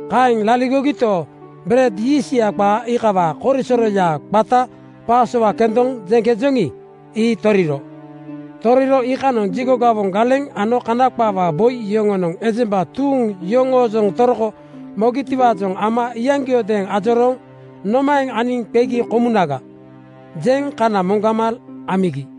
Kaeŋ laligogito, bered yiistya qaa iikawaa korisoroya, qata Pasowa kendoŋ jeŋkejoŋi, ii toriro. Toriro iikanoŋ jigo gawoŋ galeŋ ano Kana qaawaa boi yoŋonoŋ ejemba tuuŋ yoŋoojoŋ toroko mogitiwaajoŋ ama iyaŋgiodeeŋ ajorooŋ “Nomaeŋ aniŋ qegi komunaga?” jeŋ kana moŋgama amigi.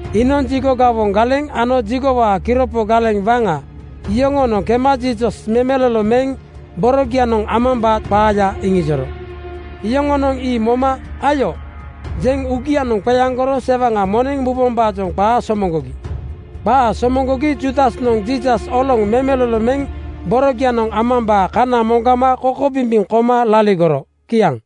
Iinoŋ jigo gawoŋ galeŋ ano jigowaa kiropo galeŋ waŋa yoŋoonoŋ kema Jiisas memelolo meŋ borogianoŋ amambaa qaaya iŋijoro. Yoŋonoŋ ii moma “Ayo!” jeŋ uugianoŋ qeaŋgoro sewaŋa moneŋ mubombaajoŋ qaa somoŋgogi. Qaa somoŋgogi Juudasnoŋ Jiisas oloŋ memelolo meŋ borogianoŋ amambaa kana moŋgama kokobimbiŋ koma laligoro. Kiaŋ.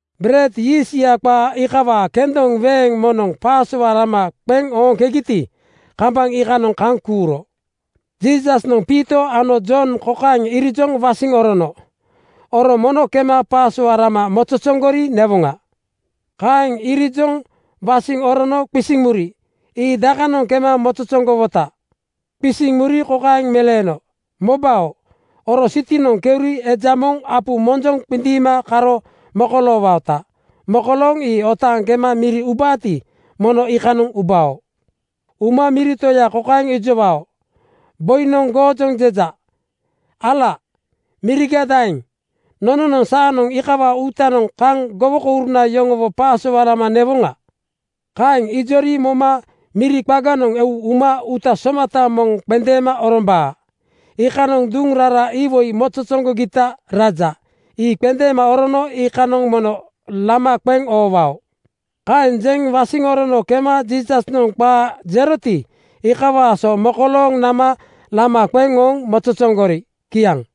Bered yiistya qaa iikawaa kendoŋ weeŋ moŋnoŋ Pasowa lama qeŋ ooŋkegiti, kambaŋ iikanoŋ kaŋ kuuro. Jiisasnoŋ Piito ano Jon kokaeŋ irijoŋ wasiŋ orono, “Oro mono kema Pasowa lama mozozoŋgori newoŋa.” Kaeŋ irijoŋ wasiŋ orono qisiŋ muri, “Ii dakanoŋ kema mozozoŋgowota?” Qisiŋ muri kokaeŋ meleeno, “Mobao, oro sitinoŋ keuri eja moŋ apu monjoŋ qindiima karo mokoloowaota. Mokolooŋ ii otaaŋ kema miri ubaati, mono iikanoŋ ubao. Uma miri toya kokaeŋ ijowao, ‘Boinoŋ goojoŋ jeja: Ala miriga daeŋ? Nononoŋ saanoŋ iikawaa uutanoŋ kaŋ gowokouruna yoŋowo Pasowa lama newoŋa?’ Kaeŋ ijori moma miri qaganoŋ eu uma uuta somata moŋ qendeema orombaa. Iikanoŋ duŋ rara iwoi mozozoŋgogita raja. Ii qendeema orono iikanoŋ mono lama qeŋ oowao.” Kaeŋ jeŋ wasiŋ orono kema Jiisasnoŋ qaa jeroti, iikawaa so mokolooŋ nama lama qeŋ ooŋ mozozoŋgori. Kiaŋ.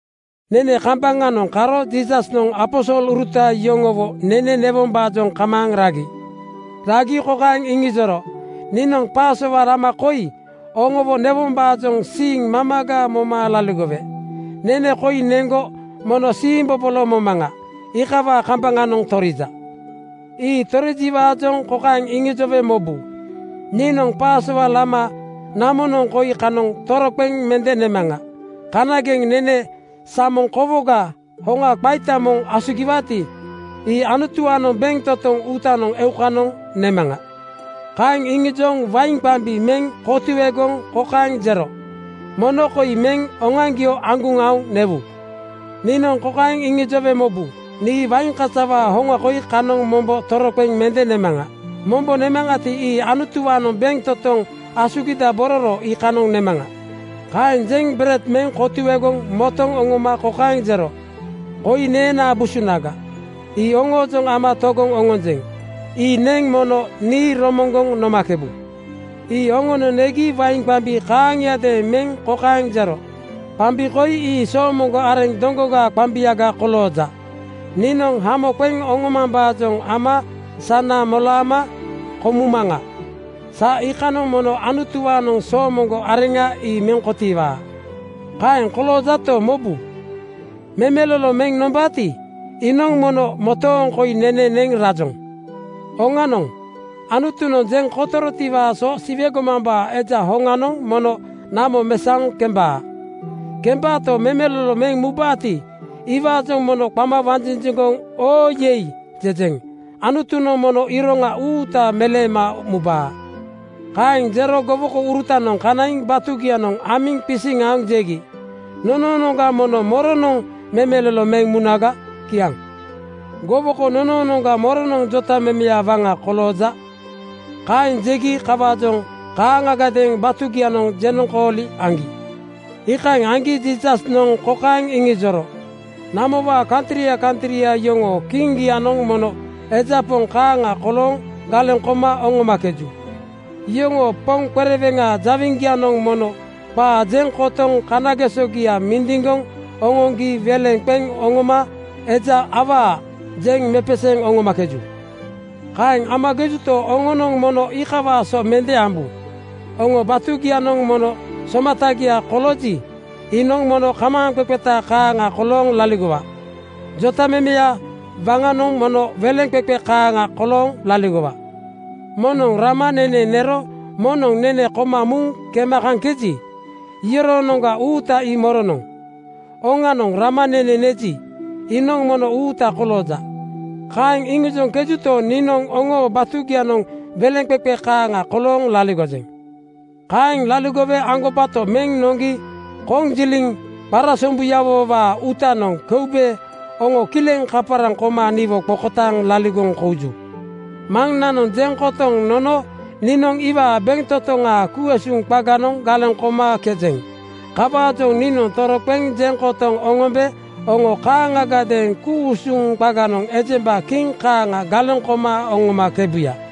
Nene kambaŋanoŋ karo Jiisasnoŋ aposoluruta yoŋowo nene newombaajoŋ kamaaŋ ragi. Ragi kokaeŋ iŋijoro, “Niinoŋ Pasowa lama koi oŋowo newombaajoŋ siiŋ mamaga moma laligowe. Nene koi neŋgo mono siimbobolo momaŋa. Iikawaa kambaŋanoŋ torija. Ii torijiwaajoŋ kokaeŋ iŋijowe mobu: Niinoŋ Pasowa lama namonoŋ koi kanoŋ toroqeŋ mende nemaŋa. Kanageŋ nene samoŋ kokawaa hoŋa qaita moŋ asugiwaati, ii Anutuwaanoŋ bentotoŋ uutanoŋ eukanoŋ nemaŋa.” Kaeŋ iŋijoŋ wain qambi meŋ kotuegoŋ kokaeŋ jero, “Mono koi meŋ oŋoaŋgio aŋguŋ aoŋ newu. Niinoŋ kokaeŋ iŋijowe mobu: Nii wain kasawaa hoŋa koi kanoŋ mombo toroqeŋ mende nemaŋa. Mombo nemaŋati, ii Anutuwaanoŋ bentotoŋ asugidabororo iikanoŋ nemaŋa.” Kaeŋ jeŋ bered meŋ kotuegoŋ motoŋ oŋoma kokaeŋ jero, “Koi neenaa busunaga. Ii oŋoojoŋ ama togoŋ oŋonjeŋ. Ii neŋ mono nii romoŋgoŋ nomakebu.” Ii oŋono negi wain qambi kaaŋiadeeŋ meŋ kokaeŋ jero, “Qambi koi ii soomoŋgo areŋ doŋgogaa qambiaga kolooja. Niinoŋ hamo qeŋ oŋomambaajoŋ ama sana molaama komumaŋa. Sa iikanoŋ mono Anutuwaanoŋ soomoŋgo areŋa ii meŋ kotiiwaa. “Kaeŋ koloojato, mobu, memelolo meŋ nombaati, iinoŋ mono motooŋ koi nene neŋ rajoŋ. Oŋanoŋ, Anutunoŋ jeŋ kotorotiwaa so Siwe gomambaa Eja hoŋanoŋ mono namo mesaoŋ kembaa. Kembaato, memelolo meŋ mubaati, iwaajoŋ mono qama wanjinjiŋgoŋ ‘Oo yei!’ jejeŋ. Anutunoŋ mono iroŋa uutaga meleema mubaa.” Kaeŋ jero gowokourutanoŋ kanaiŋ batugianoŋ amiŋ qisiŋ aoŋ jegi, “Nonoonoŋga mono moronoŋ memelolo meŋ munaga?” Kiaŋ. “Gowoko nonoonoŋga moronoŋ jotamemeya waŋa kolooja?” kaeŋ jegi kawaajoŋ kaaŋagadeeŋ batugianoŋ jenoŋkooli aŋgi. Iikaeŋ aŋgi Jiisasnoŋ kokaeŋ iŋijoro, “Namowaa kantria kantria yoŋoo kiŋgianoŋ mono eja poŋ kaaŋa kolooŋ galeŋ koma oŋomakeju. Yoŋoo poŋ qereweŋa jawiŋgianoŋ mono qaa jeŋ kotoŋ kanagesogia mindiŋgoŋ oŋoŋgi weleŋ qeŋ oŋoma ‘Eja awaa!’ jeŋ mepeseeŋ oŋomakeju. Kaeŋ amakejuto, oŋonoŋ mono iikawaa so mende ambu. Oŋoo batugianoŋ moŋnoŋ somatagia kolooji, iinoŋ mono kamaaŋqeqeta kaaŋa kolooŋ laligowa. Jotamemeya waŋanoŋ mono weleŋqeqe kaaŋa kolooŋ laligowa. “Moŋnoŋ rama nene nero moŋnoŋ nene koma muŋ kema kaŋkeji, iyoroonoŋga uuta ii moronoŋ? Oŋanoŋ, ‘Rama nene neji, iinoŋ mono uuta kolooja.’ Kaeŋ iŋijoŋkejuto, niinoŋ oŋoo batugianoŋ weleŋqeqe kaaŋa kolooŋ laligojeŋ. “Kaeŋ laligowe aŋgobato meŋ noŋgi konjiliŋ qarasombuyawowaa uutanoŋ keube oŋo kileŋ kaparaŋ koma niwo qokotaaŋ laligoŋ kouju. Maŋnanoŋ jeŋ kotoŋ nono niinoŋ iwaa bentotoŋa ku-usuŋ qaganoŋ galeŋ komakejeŋ. Kawaajoŋ niinoŋ toroqeŋ jeŋ kotoŋ oŋombe oŋo kaaŋagadeeŋ ku-usuŋ qaganoŋ ejemba kiŋ kaaŋa galeŋ koma oŋomakebuya.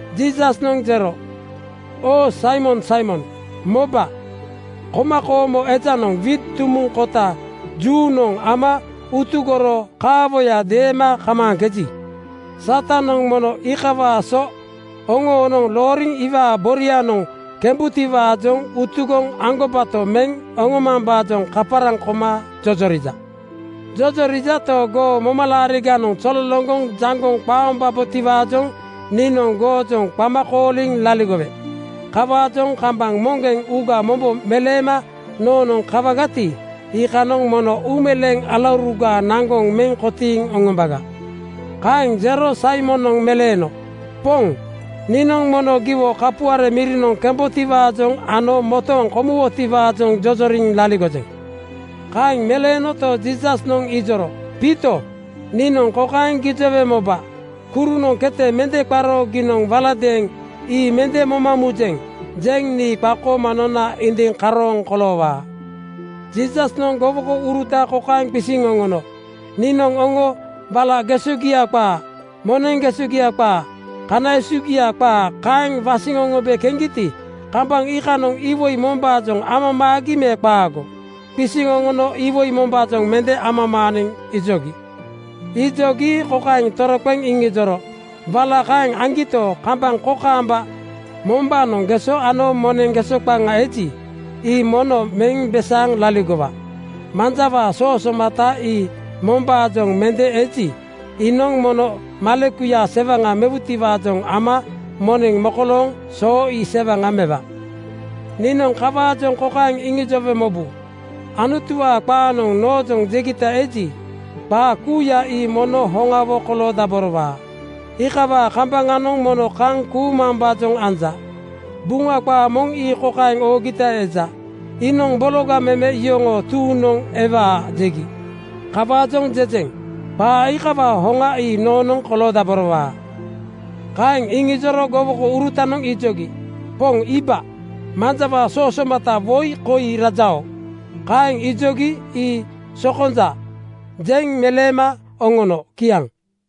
Jiisasnoŋ jero, “Oo Saimon Saimon, moba! Komakoomo ejanoŋ wiit dumuŋ kota juunoŋ ama utugoro kaawoya deema kamaaŋkeji, Satanoŋ mono iikawaa so oŋonoŋ looriŋ iwaa borianoŋ kemebutiwaajoŋ utugoŋ aŋgobato meŋ oŋomambaajoŋ kaparaŋ koma jojorija. Jojorijato, goo momalaariganoŋ zololoŋgoŋ jaŋgoŋ qaombabotiwaajoŋ niinoŋ goojoŋ qama kooliŋ laligowe. Kawaajoŋ kambaŋ moŋgeŋ uuga mombo meleema noonoŋ kawagati, iikanoŋ mono uumeleeŋ alauruga naŋgoŋ meŋ kotiiŋ oŋomba.” Kaeŋ jero Saimonoŋ meleeno, “Poŋ, niinoŋ mono giwo kapuare mirinoŋ kembotiwaajoŋ ano motooŋ komuwotiwaajoŋ jojoriŋ laligojeŋ.” Kaeŋ meleenoto, Jiisasnoŋ ijoro, “Piito, niinoŋ kokaeŋ gijowe moba: Kurunoŋ kete mende qaro giinoŋ waladeeŋ “Ii mende moma mujeŋ,” jeŋ nii qakooma nona indiŋ karooŋ koloowaa. Jiisasnoŋ gowokouruta kokaeŋ qisiŋ oŋono, “Niinoŋ oŋo wala gesogia qaa, moneŋ gesogia qaa, kana esugia qaa kaeŋ wasiŋ oŋombe keŋgiti, kambaŋ iikanoŋ iwoi mombaajoŋ amamaagi me qaago?” Qisiŋ oŋono “Iwoi mombaajoŋ mende amamaaniŋ,” ijogi. Ijogi kokaeŋ toroqeŋ iŋijoro, “Wala kaeŋ aŋgito, kambaŋ kokaamba mombaanoŋ geso ano moneŋ geso qaŋa eji, ii mono meŋ besaaŋ laligowa. Manjawaa soo somata ii mombaanoŋ mende eji, iinoŋ mono malekuya sewaŋa mewutiwaajoŋ ama moneŋ mokolooŋ soo ii sewaŋa mewa. Niinoŋ kawaajoŋ kokaeŋ iŋijowe mobu: Anutuwaa qaanoŋ noojoŋ jegita eji, qaa kuuya ii mono hoŋawo koloodaborowaa. Iikawaa kambaŋanoŋ mono kaŋ kuumambaajoŋ anja. Buŋa qaa moŋ ii kokaeŋ oogita eja, ‘Iinoŋ bologa meme yoŋoo tuuŋnoŋ ewaa, jegi.’ Kawaajoŋ jejeŋ: Qaa iikawaa hoŋa ii noonoŋ koloodaborowaa.” Kaeŋ iŋijoro gowokourutanoŋ ijogi, “Poŋ iiba, manjawaa soo somata woi koi rajao.” Kaeŋ ijogi “Ii sokonja,” jeŋ meleema oŋono. Kiaŋ.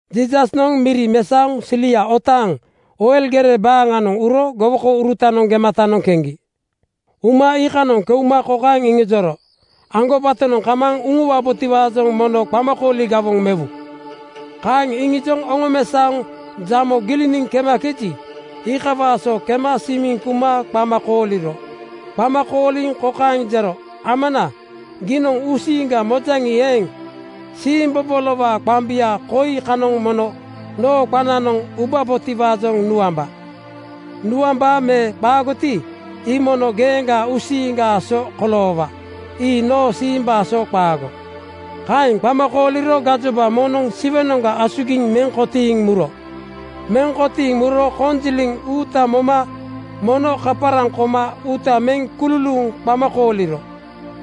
Jiisasnoŋ miri mesaoŋ silia otaaŋ Oil gere baaŋanoŋ uro gowokourutanoŋ gematanoŋ keŋgi. Uma iikanoŋ keuma kokaeŋ iŋijoro, “Aŋgobatonoŋ kamaaŋ uŋuwabotiwaajoŋ mono qamakooli gawoŋ mewu.” Kaeŋ iŋijoŋ oŋomesaoŋ jamo giliniŋ kemakeji, iikawaa so kema simiŋ kuma qama kooliro Qama kooliŋ kokaeŋ jero, “Amana, giinoŋ uusiiŋga mojaŋi eeŋ, siimbobolowaa qambia koi kanoŋ mono noo qananoŋ ubabotiwaajoŋ nuamba. Nuambaa me qaagoti, ii mono geeŋgaa uusiiŋgaa so koloowa. Ii noo siimbaa so qaago.” Kaeŋ qama kooliro gajoba moŋnoŋ Siwenoŋga asugiŋ meŋ kotiiŋ muro. Meŋ kotiiŋ muro konjiliŋ uuta moma mono kaparaŋ koma uuta meŋ kululuuŋ qama kooliro.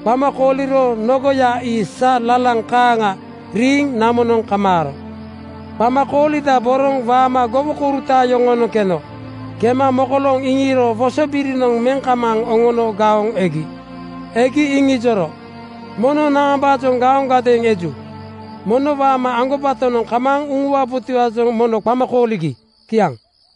Qama kooliro nogoya ii sa lalaŋ kaaŋa riiŋ namonoŋ kamaaro. Qama koolidaboroŋ waama gowokouruta yoŋoonoŋ keno. Kema mokolooŋ iŋiiro wosobirinoŋ meŋ kamaaŋ oŋono gaoŋ egi. Egi iŋijoro, “Mono naambaajoŋ gaoŋgadeeŋ eju? Mono waama aŋgobatonoŋ kamaaŋ uŋuwabotiwaajoŋ mono qama kooligi.” Kiaŋ.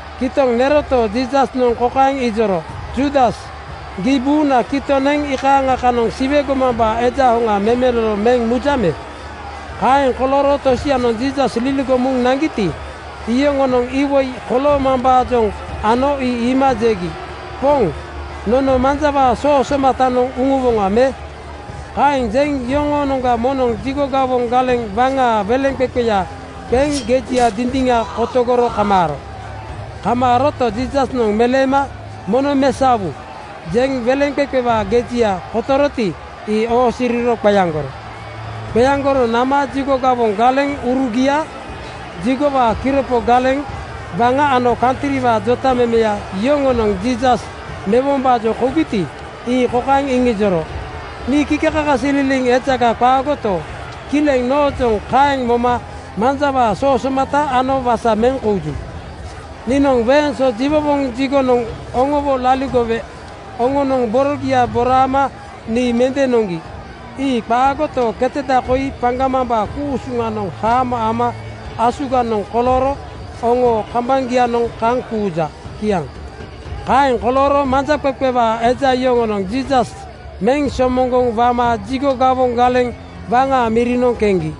Kitoŋ neroto, Jiisasnoŋ kokaeŋ ijoro, “Juudas, gii buuna kitoŋ neŋ iikaaŋa kanoŋ Siwe gomambaa Eja hoŋa memelolo meŋ mujaŋ me?” Kaeŋ kolooro tosianoŋ Jiisas liligoŋ muŋ naŋgiti, iyoŋonoŋ iwoi koloomambaajoŋ ano ii iima jegi, “Poŋ, nono manjawaa soo somatanoŋ uŋuwoŋa me?” Kaeŋ jeŋ yoŋoonoŋga moŋnoŋ jigo gawoŋ galeŋ waŋaa weleŋqeqeya qeŋ gejia dindiŋa kotogoro kamaaro. Kamaaroto, Jiisasnoŋ meleema “Mono mesaowu!” jeŋ weleŋqeqewaa gejia kotoroti, ii oosiriro qeaŋgoro. Qeaŋgoro nama jigo gawoŋ galeŋurugia, jigowaa kiropo galeŋ (sikiriti) waŋa ano kantriwaa jotamemeya yoŋonoŋ Jiisas mewombaajoŋ kougiti, ii kokaeŋ iŋijoro, “Nii kikekakasililiŋ ejaga qaagoto, kileŋ noojoŋ kaeŋ moma manjawaa soo somata ano wasa meŋ kouju. Niinoŋ weeŋ so jiwowoŋ jigonoŋ oŋowo laligowe oŋonoŋ borogia boraama nii mende noŋgi. Ii qaagoto, keteda koi paŋgamambaa ku-usuŋanoŋ haamo ama asuganoŋ kolooro oŋoo kambaŋgianoŋ kaŋ kuuja.” Kiaŋ. Kaeŋ kolooro manjaqeqe eja yoŋonoŋ Jiisas meŋ somoŋgoŋ wama jigo gawoŋ galeŋ waŋaa mirinoŋ keŋgi.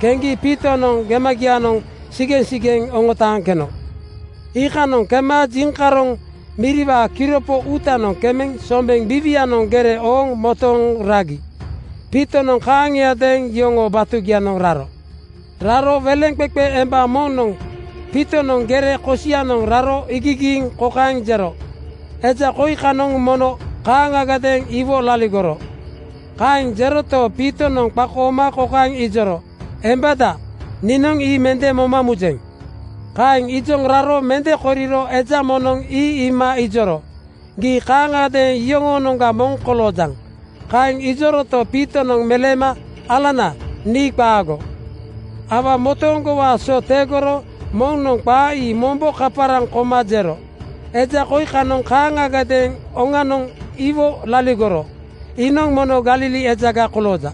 Keŋgi Piitonoŋ gemagianoŋ sigeŋsigeŋ oŋotaaŋ keno. Iikanoŋ kema jiŋkaroŋ miriwaa kiropo uutanoŋ kemeŋ sombeŋ biiwianoŋ gere ooŋ motooŋ ragi. Piitonoŋ kaaŋiadeeŋ yoŋoo batugianoŋ raro. Raro weleŋqeqe emba moŋnoŋ Piitonoŋ gere kosianoŋ raro iigigiiŋ kokaeŋ jero, “Eja koi kanoŋ mono kaaŋagadeeŋ iwo laligoro.” Kaeŋ jeroto, Piitonoŋ qakooma kokaeŋ ijoro, “Embada, niinoŋ ii mende moma mujeŋ.” Kaeŋ ijoŋ raro mende koriro eja moŋnoŋ ii iima ijoro, “Gii kaaŋagadeeŋ iyoŋoonoŋga moŋ koloojaŋ.” Kaeŋ ijoroto, Piitonoŋ meleeno, “Alana, nii qaago.” Aua motooŋgowaa so tegoro moŋnoŋ qaa ii mombo kaparaŋ koma jero, “Eja koi kanoŋ kaaŋagadeeŋ oŋanoŋ iwo laligoro. Iinoŋ mono Galili ejaga kolooja.”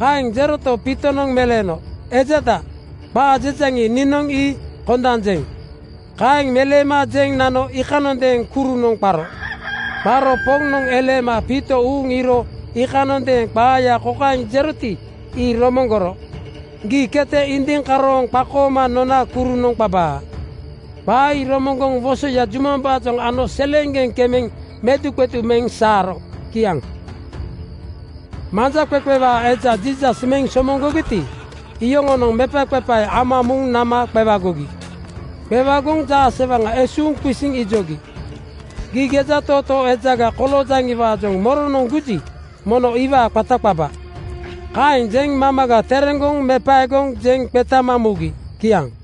Kaeŋ jeroto, Piitonoŋ meleeno, “Ejada, qaa jejaŋi, niinoŋ ii kondanjeŋ.” Kaeŋ meleema jeŋ nano iikanondeeŋ kurunoŋ qaro. Qaro Poŋnoŋ eleema Piito uuŋ iiro iikanondeeŋ qaaya kokaeŋ jeroti, ii romoŋgoro, ‘Gii kete indiŋ karooŋ qakooma nona kurunoŋ qabaa.’ Qaa ii romoŋgoŋ wosoya jumambaajoŋ ano seleeŋgeŋ kemeŋ meduqedu meŋ saaro. Kiaŋ. Manjaqeqe eja Jiisas meŋ somoŋgogiti, iyoŋonoŋ mepaqepae ama muŋ nama qewagogi. Qewagoŋ jaasewaŋa esuuŋ qisiŋ ijogi, “Gii gejatootoo ejaga koloojaŋiwaajoŋ moronoŋ guji, mono iwaa qata qaba!” Kaeŋ jeŋ mamaga tereŋgoŋ mepaegoŋ jeŋ qetama mugi. Kiaŋ.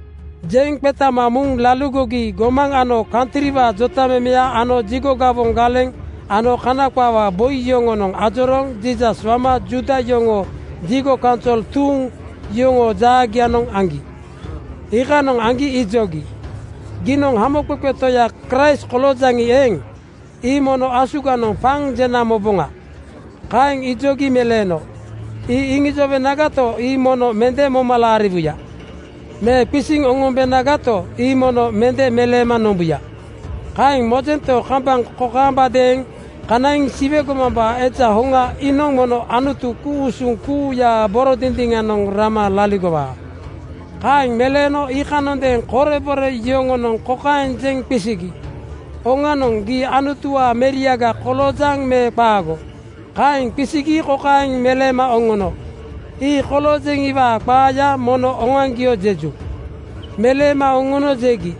Jeŋ qetama muŋ laligogi gomaŋ ano kantriwaa jotamemeya ano jigo gawoŋ galeŋ ano Kana qaawaa boi yoŋonoŋ ajorooŋ Jiisas wama Juuda yoŋoo jigo kaunsol tuuŋ yoŋoo jaagianoŋ aŋgi. Iikanoŋ aŋgi ijogi, “Giinoŋ Hamoqeqe Toya Kraist koloojaŋi eeŋ, ii mono asuganoŋ paŋ jena moboŋa.” Kaeŋ ijogi meleeno, “Ii iŋijowenagato, ii mono mende moma laariwuya. Me qisiŋ oŋombenagato, ii mono mende meleema nombuya. Kaeŋ mojento, kambaŋ kokaambadeeŋ kanaiŋ Siwe gomambaa Eja hoŋa iinoŋ mono Anutu, ku-usuŋ Toyaa boro dindiŋanoŋ rama laligowaa.” Kaeŋ meleeno iikanondeeŋ korebore yoŋonoŋ kokaeŋ jeŋ qisigi, “Oŋanoŋ, gii Anutuwaa meriaga koloojaŋ me qaago?” Kaeŋ qisigi kokaeŋ meleema oŋono, “Ii koloojeŋiwaa qaaya mono oŋoaŋgio jeju.” Meleema oŋono jegi,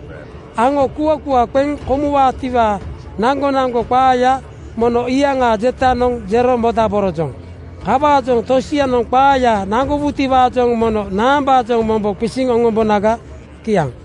“Aŋo kuakua qeŋ komuwaatiwaa naŋgonaŋgo qaaya mono iyaŋaa jetanoŋ jero modaborojoŋ. Kawaajoŋ tosianoŋ qaaya naŋgowutiwaajoŋ mono naambaajoŋ mombo qisiŋ oŋombonaga?” Kiaŋ.